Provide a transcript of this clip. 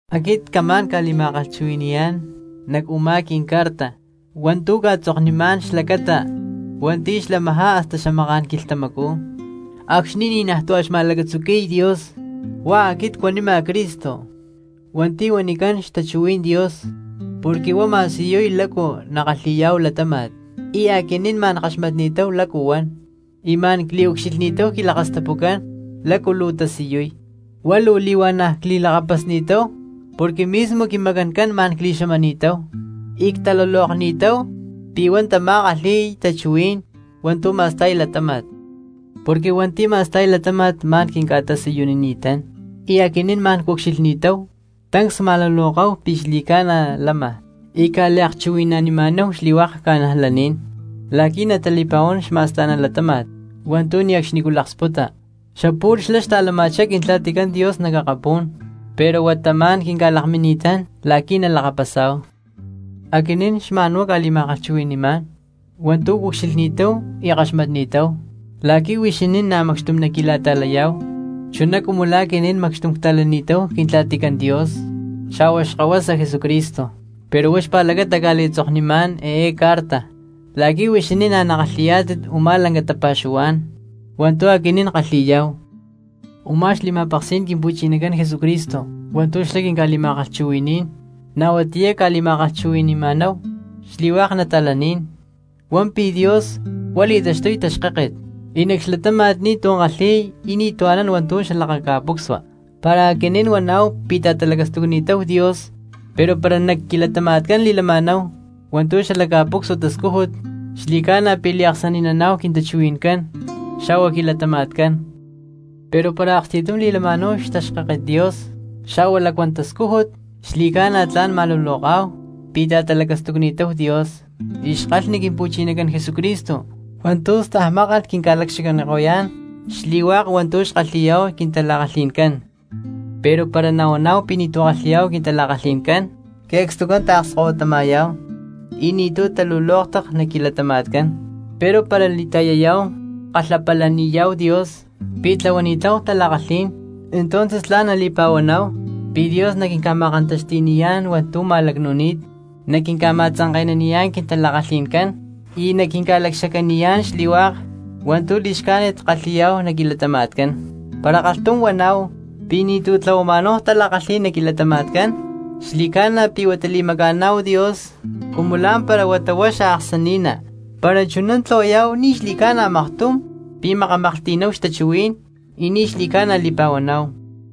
Aquit camá̠n ca̠li̠ma̠kalhchuhui̠ni̠yá̠n nac u̠má quincarta hua̠ntu̠ cca̠tzoknimá̠n xlacata hua̠nti̠ xlamajá hasta xamaká̠n quilhtamacú acxni̠ ni̠najtú a̠ xma̠lacatzuqui̠y Dios. Huá aquit cuanima Cristo hua̠nti̠ huanicán Xtachuhuí̠n Dios porque huá ma̠siyuy lácu nakalhi̠yá̠hu latáma̠t, y aquinín ma̠n ckaxmatni̠táhu lácu huan, y ma̠n cliucxilhni̠táhu quilakastapucán lácu luu tasiyuy, huá luu li̠huana̠ cli̠lakapasni̠táhu porque mismo quimacancán ma̠n cli̠xamani̠táhu y ctalulokni̠táhu pi̠ huá tamá xkalhi̠y tachuhuí̠n hua̠ntu̠ ma̠sta̠y latáma̠t. Porque hua̠nti̠ ma̠sta̠y latáma̠t ma̠n quinca̠tasiyunini̠tán y aquinín ma̠n cucxilhni̠táhu, tancs cma̠luloká̠hu pi̠ xli̠ca̠na lama y cca̠liakchuhui̠nanima̠náhu xli̠hua̠k cristianos la̠qui̠ natali̠pa̠huán xma̠sta̠ná latáma̠t hua̠ntu̠ ne̠cxnicú nalaksputa. Xapu̠lh xlá xta̠lama̠chá Quintla̠ticán Dios nac akapú̠n pero huata ma̠n quinca̠lakmini̠tán la̠qui̠ nalakapasá̠hu. Aquinín xma̠n huá cca̠li̠ma̠kalhchuhui̠ni̠má̠n hua̠ntu̠ cucxilhni̠táhu y ckaxmatni̠táhu la̠qui̠ huixinín na̠ macxtum naqui̠la̠ta̠layá̠hu chuná cumu la̠ aquinín macxtum cta̠lani̠táhu Quintla̠ticán Dios xa̠hua Xkahuasa Jesucristo. Pero huá xpa̠lacata cca̠li̠tzoknimá̠n eé carta la̠qui̠ huixinín na̠ nakalhi̠yá̠tit u̠má lanca tapa̠xuhuá̠n hua̠ntu̠ aquinín ckalhi̠yá̠hu. Umá xli̠ma̠peksí̠n Quimpu̠chinacán Jesucristo hua̠ntu̠ xlá quinca̠li̠ma̠kalhchuhui̠ní̠n, na̠ huatiyá cca̠li̠ma̠kalhchuhui̠ni̠ma̠náhu xli̠hua̠k cristianos, huan pi̠ Dios huá li̠taxtuy taxkáket y nac xlatáma̠t ni̠tu̠ kalhi̠y y ni̠ anán hua̠ntu̠ xalakaca̠pucsua. Para aquinín huaná̠hu pi̠ ta̠talacastucni̠táhu Dios pero para nac quilatama̠tcán li̠lama̠náhu hua̠ntu̠ xalac ca̠pucsua tascújut xli̠ca̠na pi̠ liaksani̠naná̠hu quintachuhui̠ncán xa̠hua quilatama̠tcán. Pero para aksti̠tum li̠lama̠náhu xtaxkáket Dios xa̠hua lacuán xtascújut, xli̠ca̠na tla̠n ma̠luloká̠hu pi̠ ta̠talacastucni̠táhu Dios y xkalhni Quimpu̠chinacán Jesucristo hua̠ntu̠ stajmákalh quinca̠lacxacaniko̠yá̠n xli̠hua̠k hua̠ntu̠ xkalhi̠yá̠hu quintala̠kalhi̠ncán. Pero para nahuaná̠hu pi̠ ni̠tu̠ kalhi̠yá̠hu quintala̠kalhi̠n, que̠cstucán taakskahuitama̠yá̠hu y ni̠tu̠ talulóktat nac quilatama̠tcán. Pero para li̠ta̠yayá̠hu kalhapalaniyá̠hu Dios pi̠ tlahuani̠táhu tala̠kalhí̠n entonces tla̠n nali̠pa̠huaná̠hu pi̠ Dios naquinca̠ma̠kantaxti̠niyá̠n hua̠ntu̠ ma̠lacnu̠ni̠t, naquinca̠ma̠tzanke̠naniyá̠n quintala̠kalhi̠ncán y naquinca̠lacxacaniyá̠n xli̠hua̠k hua̠ntu̠ li̠xcájnit kalhi̠yá̠hu nac quilatama̠tcán. Para kalhtum huaná̠hu pi̠ ni̠tu̠ tlahuama̠náhu tala̠kalhí̠n nac quilatama̠tcán, xli̠ca̠na pi̠ huata li̠maca̠náhu Dios cumu lá̠mpara huata huá xaaksani̠ná, para chuná tlahuayá̠hu ni̠ xli̠ca̠na maktum pi̠ makamaklhti̠nani̠táhu xtachuhuí̠n y ni̠ xli̠ca̠na li̠pa̠huaná̠hu.